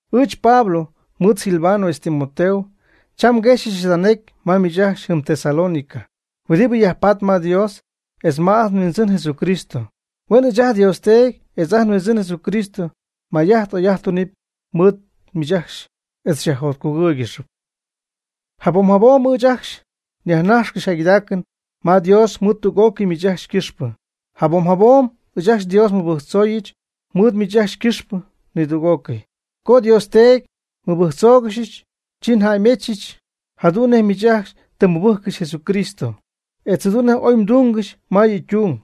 Ɨɨch Pablo mɨɨd Silvano etz Timoteo cham nguexyɨch jada necy ma miich ajcxy jɨm Tesalónica huɨdibɨ yajpaatp ma Dios etz ma ajt nHuindzɨn Jesucristo. Huen ɨɨch ajt nDios Teedy etz ajt nHuindzɨn Jesucristo may'ajt oy'ajt tunɨpy mɨɨd miich ajcxy etz xyajjotcugɨ́ɨygɨxɨp. Jabom jabom ɨɨch ajcxy nyajnaxyɨch jäygɨdaacɨn ma Dios mɨɨd tüg'ócɨy miich ajcxy ycɨxpɨ. Jabom jabom ɨɨch ajcxy Dios nmɨbɨjctzooyɨch mɨɨd miich ajcxy ycɨxpɨ nidüg'ócɨy. Co Dios Teedy nmɨbɨjctzóoygɨxyɨch, chi njäymechɨch jadu'n nej miich ajcxy tɨ mmɨbɨjccɨxy Jesucristo, etz jadu'n nej oy mdungɨxy ma yɨ' ytung.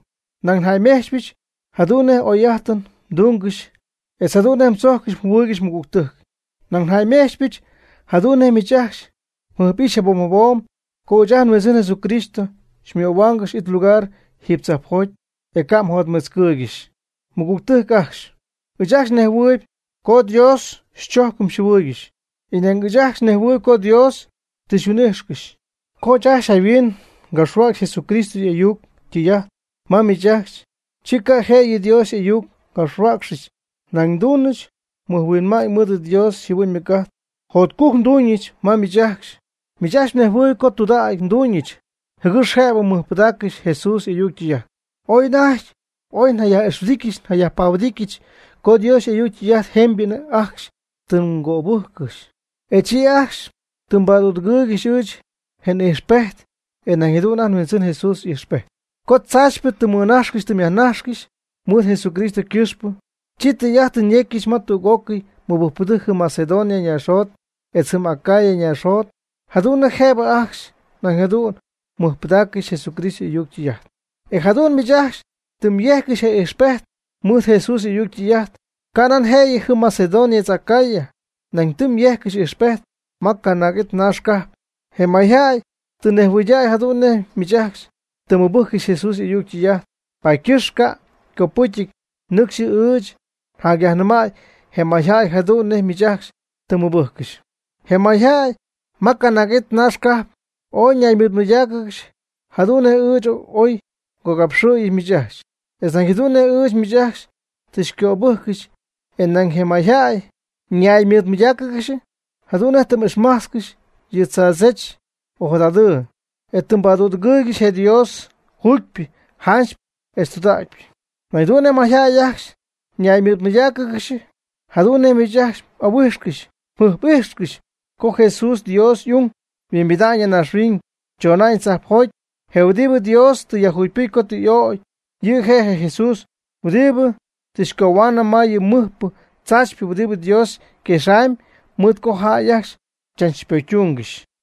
Nañ njäymejchɨch jadu'n nej oyjäy'ajtɨn mdungɨxy etz jadu'n nej mdzojccɨxy mjɨhuɨɨygɨxy mmɨgügtɨjc. Nañ jäymejtzpɨch jadu'n nej miich ajcxy mjɨjp'ixy jabom jabom co ɨɨch ajt nHuindzɨn Jesucristo xymöhuaangɨxy it lugar jiiby tzajpjoty, e ca' mjotmetzcɨɨygɨxy. Mɨgügtɨjc ajcxy, ɨɨch ajcxy nejhuɨɨyb co Dios xychojccɨxy xyjɨhuɨɨygɨxy, e nañ ɨɨch ajcxy nejhuɨɨyb co Dios tɨ xyhuin'ijxcɨxy. Co ɨɨch ajcxy jayhuin ngapxhuäcxy Jesucristo y' ayuc ytɨy'ajt ma miich ajcxy, chi ca' jëyɨ Dios y'ayuc ngapxhuäcxɨch, nañ nduunɨch mɨjhuinma'ñ mɨɨd Dios yjɨhuɨ'ñ ymɨc'ajt. Jotcujc nduuñɨch ma miich ajcxy. Miich ajcxy mnejhuɨɨyb co tudägy nduuñɨch jɨgɨx jëbɨ mmɨjpɨdáaccɨxɨpy Jesús y'ayuc ytɨy'ajt. Oy anajty ooy mjayaj'ixhuɨdijtcɨxy mjayajpahuɨdijtcɨxy co Dios y'ayuc ytɨy'ajt jemybɨ ajcxy tɨ mgöbɨjccɨxy, e chi ajcxy tɨ mbadüdɨgɨɨygɨxy ɨɨch je n'ijxpejt, e nañ jadu'n ajt nHuindzɨn Jesús y'ijxpejt. Co tzaachypɨ tɨ mmɨnajxcɨxy tɨ myajnajxcɨxy mɨɨd Jesucristo ycɨxpɨ, chi tɨy'ajt tɨ myejccɨxy ma tüg'ócɨy mɨbɨjcpɨdɨjc jɨm Macedonia naaxjot etz jɨm Acaya naaxjot jadu'n nej jëbɨ ajcxy nañ jadu'n mɨjpɨdaaccɨxy Jesucristo y'ayuc ytɨy'ajt. E jadu'n miich ajcxy tɨ myejccɨxy je ijxpejt mɨɨd Jesús y'ayuc ytɨy'ajt, canan jëyɨ jɨm Macedonia etz Acaya, nañ tɨ myejccɨxy ijxpejt ma canaag'it naax cajp. Je mayjäy tɨ nejhuɨydäy jadu'n nej miich ajcxy tɨ mmɨbɨjccɨxy Jesús y'ayuc ytɨy'ajt, paady ycɨxpɨ ca' ycopɨcyɨty nɨcxy ɨɨch ajcxy njacyajnɨmäy je mayjäy jadu'n nej miich ajcxy tɨ mmɨbɨjccɨxy. Je mayjäy ma canaag'it naaxcajp ooy ñaymɨɨdmɨydáacɨgɨxy jadu'n nej ɨɨch oy ngogapxɨ̈yɨch miich ajcxy, etz nañ jadu'n nej ɨɨch miich tɨ xycöbɨ́jccɨxyɨch e nañ je mayjäy ñaymɨɨdmɨydáacɨgɨxy jadu'n nej tɨ m'ixmajtzcɨxy yɨ tzaadzech ojadadɨɨ, e tɨ mbadüdɨgɨɨygɨxy je Dios juugypɨ janchypɨ etz tudägypɨ. Nañ jadu'n je mayjäy ajcxy ñaymɨɨdmɨydáacɨgɨxy jadu'n nej miich ajcxy m'ahuijxcɨxy mjɨjp'ijxcɨxy co Jesús, Dios y'ung, yhuimbida'ñ ya naaxhuiñ, chona'ñ tzajpjoty. Je huɨdibɨ Dios tɨ yajjugypɨjc co tɨ y'ögy. Yɨ' je' je Jesús huɨdi tɨ xycohuaanɨm ma yɨ mɨjpɨ tzaachypɨ huɨdibɨ Dios yquexamyb mɨɨd co jäy ajcxy chach pocytungɨxy.